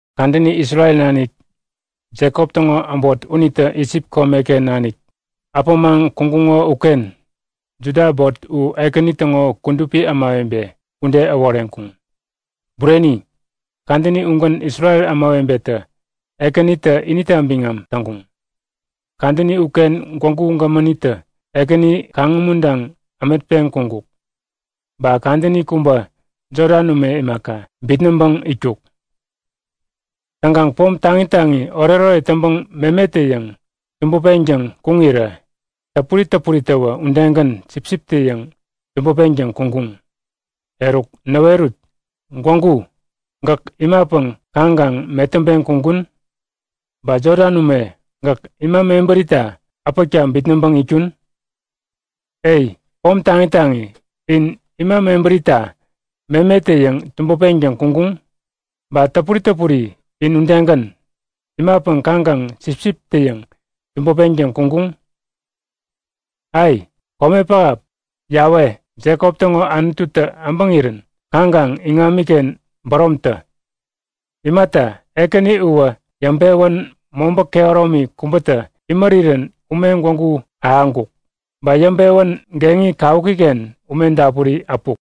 Kadäni Isrel nanik Jekop täŋo äbot unitä Isip komeken nanik äpämaŋ kuŋkuŋo uken, Juda äbot u Ekäni täŋo kudupi ämawebe ude äworeŋkuŋ. Bureni, kadäni ugän Isrel ämawebetä Ekänitä inita biŋam täŋkuŋ. Kadäni uken Gwägu Gämänitä Ekäni kaŋ-umuntaŋ ämetpeŋ kuŋkuk. Ba kadäni kubä Jodan ume imaka, bitnäŋpäŋ itkuk. Täŋkaŋ pom taŋi taŋi oretoret täŋpäŋ memetä-yäŋ tubupeŋtäŋ kuŋirä, täpuri täpuriwä udegän sipsiptä-yäŋ tubupeŋtäŋ kuŋkuŋ. Eruk näwerut; Gwägu, gäk imapäŋ kaŋkaŋ metäŋpeŋ kuŋkun? Ba Jodan ume, gäk ima mebärita äpäkta bitnäŋpäŋ itkun? E, pom taŋi taŋi, in ima mebärita memetä-yäŋ tubupeŋtäŋ kuŋkuŋ? Ba täpuri täpuri in udegän, imapäŋ kaŋkaŋ sipsiptä-yäŋ tubupeŋtäŋ kuŋkuŋ? Ai, kome pähap, Yawe, Jekop täŋo Anututä äbäŋirän kaŋkaŋ iŋamiken bäromtä! Imata, Ekäni uwä yäŋpewän mobä kehäromi kubätä imärirän ume gwägu ahäŋkuk. Ba yäŋpewän geŋi kawukiken ume dapuri äpuk.